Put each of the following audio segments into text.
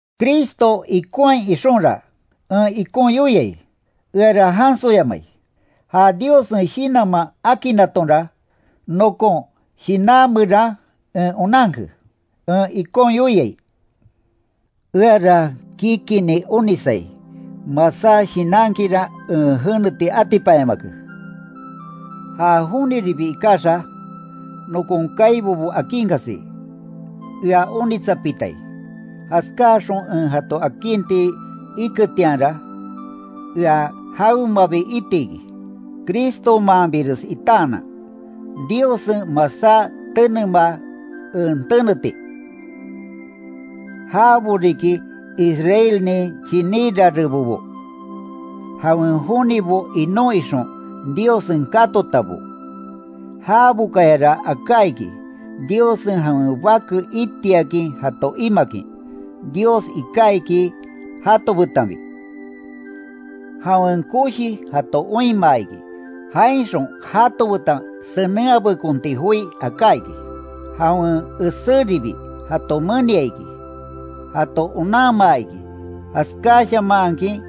Cristo ikonhai ixonra, en ikon yoiai, eara jansoyamai. Ja Diossen Shinanman akinnatonra, nokon shinan meran en onanke, en ikon yoiai: Eara kikinni onisai, masá shinankinra en jeneti atipanyamake. Ja joniribi ikaxa, nokon kaibobo akinkasi, ea onitsapitai, jaskáaxon en jato akinti iketianra, ea jawemabi itiki, Cristomaanbires itaanan, Diossen masá tenemaa en teneti. Jabo riki Israelnin chiní rarebobo, jawen jonibo inon ixon, Diossen katotabo, jabokayara aka iki, Diossen jawen bake itiakin jato imakin. Dios iká iki jato betanbi; jawen koshi jato oinmaa iki, jainxon jato betan senenhabekonti joi aká iki, jawen eséribi jato menia iki, jato onanmaa iki, jaskáshamaankin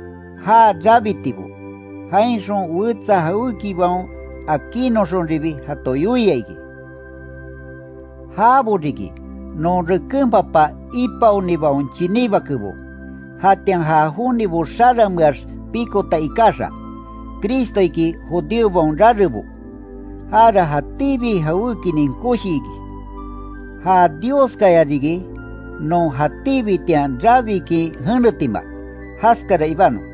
já rabitibo, jainxon wetsa jawékibaon akinoxonribi jato yoia iki. Jabo riki, non reken papa ipaonibaon chiní bakebo, jatian ja jonibo xarameax pikota ikaxa, Cristo iki judíobaon rarebo. Jara jatíbi jawékinin koshi iki, ¡Ja Dioskaya riki, non jatíbitian rabikin jenetima! Jaskara ibanon.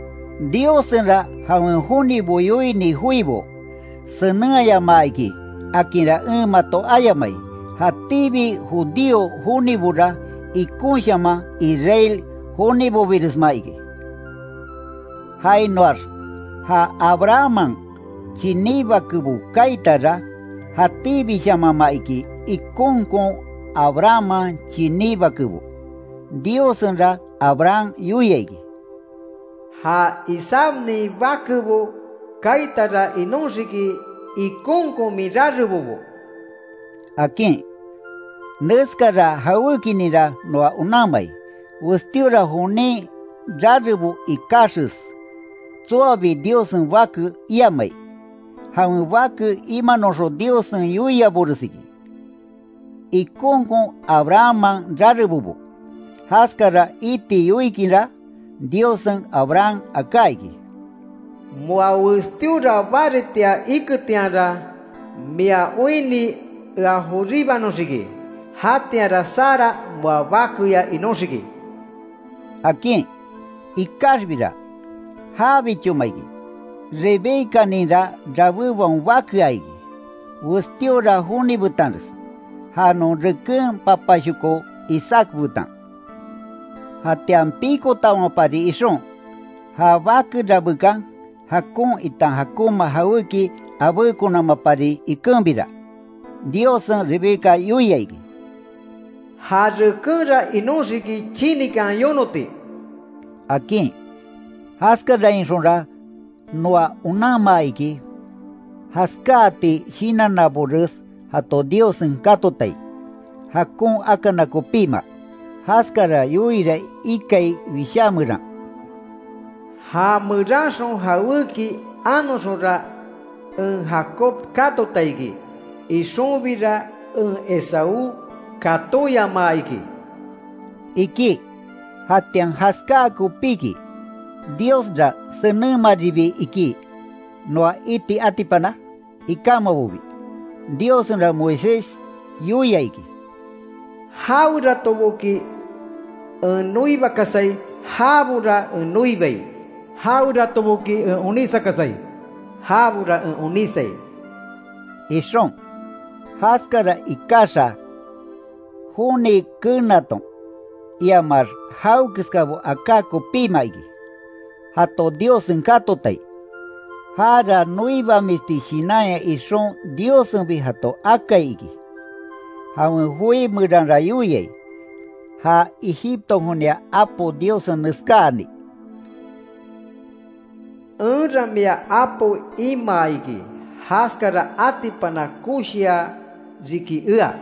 Diossenra jawen jonibo yoini joibo, senenhayamaa iki, akinra en mato ayamai, jatíbi judío jonibora ikonshaman Israel jonibobiresma iki. Jainoax ja Abrahamman chiní bakebo kaitara, jatíbishamanma iki ikonkon Abrahamman chiní bakebo. Diossenra Abraham yoia iki: “Ja Isaacnin bakebo kaitara inóxiki, ikonkon min rarebobo”, akin. Neskara jawékininra noa onanmai, westíora jonin rarebo ikaxes, tsoabi Diossen bake iamai. Jawen bake imanoxon Diossen yoiabores iki, ikonkon Abrahamman rarebobo. Jaskara iti yoikinra, Diossen Abraham aká iki: “Moa westíora baritia iketianra, mia oinni ea joríbanoxiki, jatianra Sara moa bakeya inóxiki”, akin. Ikaxbira, jabichoma iki. Rebecaninra rabébaon bakea iki, westíora joni betanres, ja non reken papashoko Isaac betan. Jatian pikotamapari ixon, ja bake rabekan, jakon, itan jakonma jawéki abékonamapari ikenbira, Diossen Rebeca yoia iki: “Ja rekenra inoxiki, chinikan yonoti”, akin. Jaskarainxonra noa onanmaa iki, jaskáati shinannabores jato Diossen katotai, jakon akana kopíma. Jaskara yoiira ikai Wishá meran: “Já meranxon jawéki anoxonra, en Jacob katota iki, ixonbira en Esaú katóyamaa iki”, iki. ¿Jatian jaskáa kopíki, Diosra senenmaribi iki, noa iti atipana? Ikámabobi. Diossenra Moisés yoia iki: “Jaweratoboki en noibakasai, jabora en noibai. Jaweratoboki en onísakasai, jabora en onísai”, ixon. Jaskara ikaxa, joni keenaton, iamax jawekeskabo aká kopíma iki, jato Diossen katotai. Jara noibamisti shinanya ixon Diossenbi jato akai iki. Jawen joi meranra yoiai, ja Egiptonkonia apo Diossen neskáani: “Enra mia apo imaa iki, jaskara atipana koshia riki ea,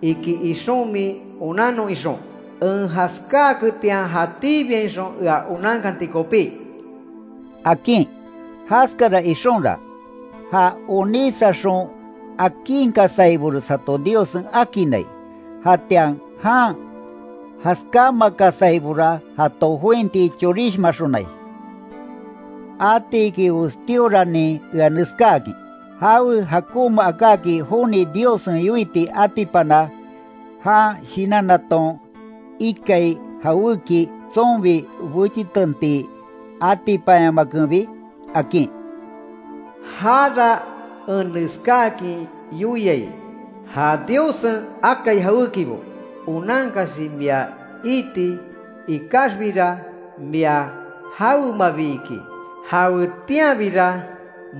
iki ixon min onannon ixon. En jaskáaketian, jatíbiainxon ea onankanti kopí”, akin. Jaskara ixonra, ja onísaxon akinkasaibores jato Diossen akinnai, jatian jan jaskámakasaibora jato jointi chorishmaxonai. Atiki westíoranin ea neskáakin: ¿Jawe jakonma akáki joni Diossen yoiti atipana, jan shinannaton ikai jawéki tsonbi bechitenti atipanyamakenbi? akin. Jara en neskáakin yoiai: Ja Diossen akai jawékibo onankasi mia iiti ikaxbira, mia jawemabi iki. Jawetianbira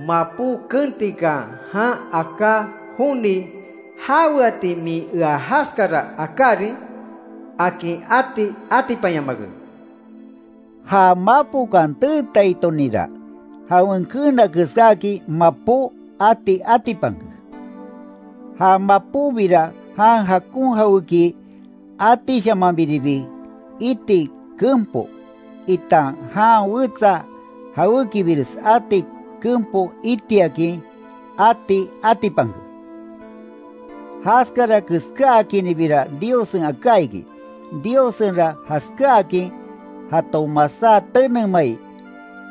mapó kentikan, jan aká joni, “¿Jaweati min ea jaskara akárin?” akin ati atipanyamake. Ja mapokan teetaitoninra, jawen keena keskáakin mapó ati atipanke. Ja mapóbira jan jakon jawéki atishamanbiribi iti kenpo, itan jan wetsa jawékibires ati kenpo itiakin ati atipanke. Jaskara keskáakinribira Diossen aká iki, Diossenra jaskáakin jato masá tenemai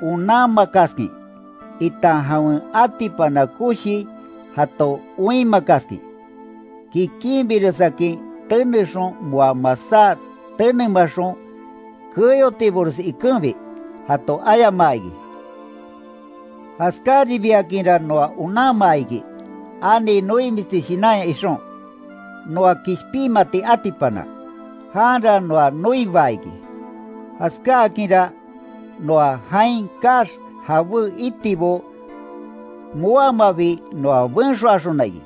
onanmakaskin, itan jawen atipana koshi jato oinmakaskin, kikinbiresakin tenexon moa masá tenemaxon keyotibores ikenbi, jato ayamaa iki. Jaskaribiakinra noa onanmaa iki, ani noimisti shinanya ixon, noa kishpinmati atipana. Janra noa noibaa iki, jaskáakinra, noa jain kaax jabé itibo moamabi noa benxoaxona iki.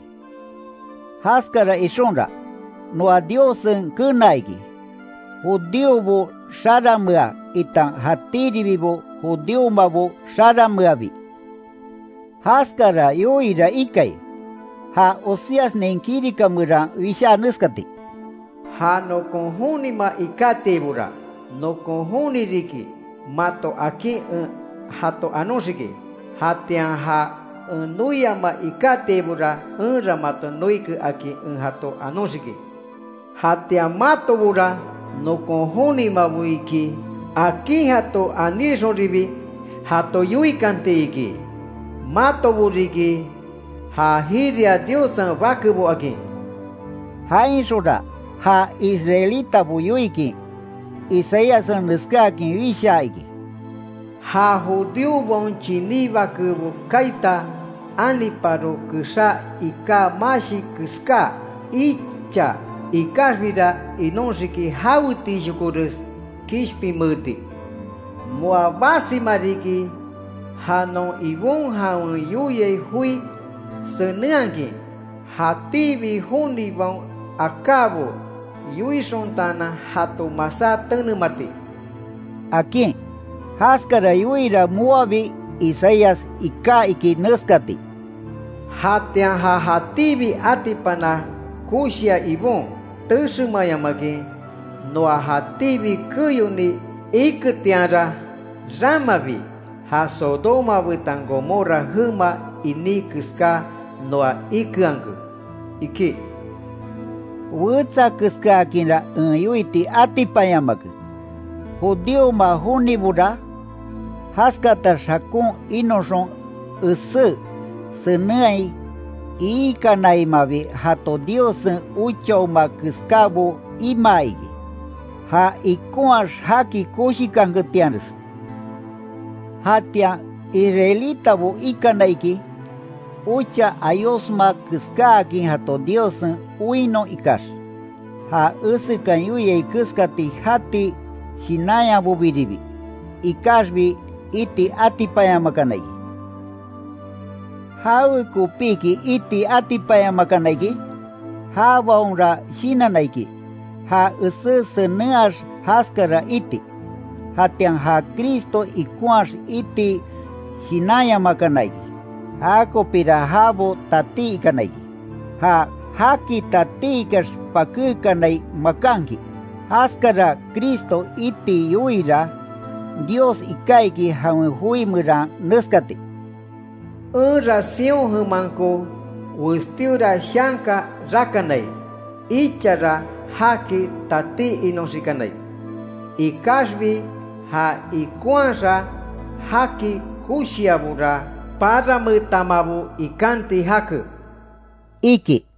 Jaskara ixonra, noa Diossen kenaa iki, judíobo xaranmea itan jatíribibo judíomabo xarameabi. Jaskara yoira ikai, ja Oseasnin kirika meran wishaa neskati: “Ja nokon jonima ikatiaibora, nokon joni riki mato, akin en jato anoxiki. Jatian ja en noiama ikatiaibora, enra mato noike, akin en jato anoxiki. Jatian, ‘matobora nokon jonimabo iki’ akin jato aníainxonribi, jato yoikanti iki: Matobo riki ja jiria Diossen bakebo”, akin. Jainxonra ja israelitabo yoikin Isaíassen neskáakin wishaa iki: “Ja judíobaon chiní bakebo kaita, aniparo kexá iká mashi keska icha ikaxbira inóxiki, jawetiishokores kishpinmeeti. Moa basima riki ja non Ibon jawen yoia joi senenhakin, jatíbi jonibaon akábo yoixontaanan, jato masá tenemati”, akin. Jaskara yoira moabi Isaías iká iki neskati: “Jatian ja jatíbi atipana koshia Ibon, Texemayamakin, noa jatíbi keyoni iketianra, ramabi ja Sodoma betan Gomorra jema iní keska noa ikeanke”, iki. Wetsa keskaakinra en yoiti atipanyamake. Judíoma jonibora, jaskatax jakon inoxon esé senenhai iikanainmabi jato Diossen ochaoma keskábo imaa iki, ja ikonhaax jaki koshikanketianres. Jatian Israelitabo ikana iki, ocha ayosma keskáakin jato Diossen oinnon ikax, ja esekan yoiai keskati jati shinanyabobiribi, ikaxbi iti atipanyamakana iki. ¿Jawekopiki iti atipanyamakana iki? Jabaonra shinanna iki, ja esé senenhaax jaskara iti, jatian ja Cristo ikonhaax iti shinanyamakana iki. Jakopira jabo tatí ikana iki, ja “jaki tatí ikax pakékanai makanki”. Jaskara Cristo iti yoiira, Dios iká iki jawen joi meran neskati: “Enra Sión jemanko, westíora shanka rakanai. Ichara jaki tatí inoxikanai. Ikaxbi, já ikonhaax jaki koshiaibora, parameetamabo ikanti jake”, iki.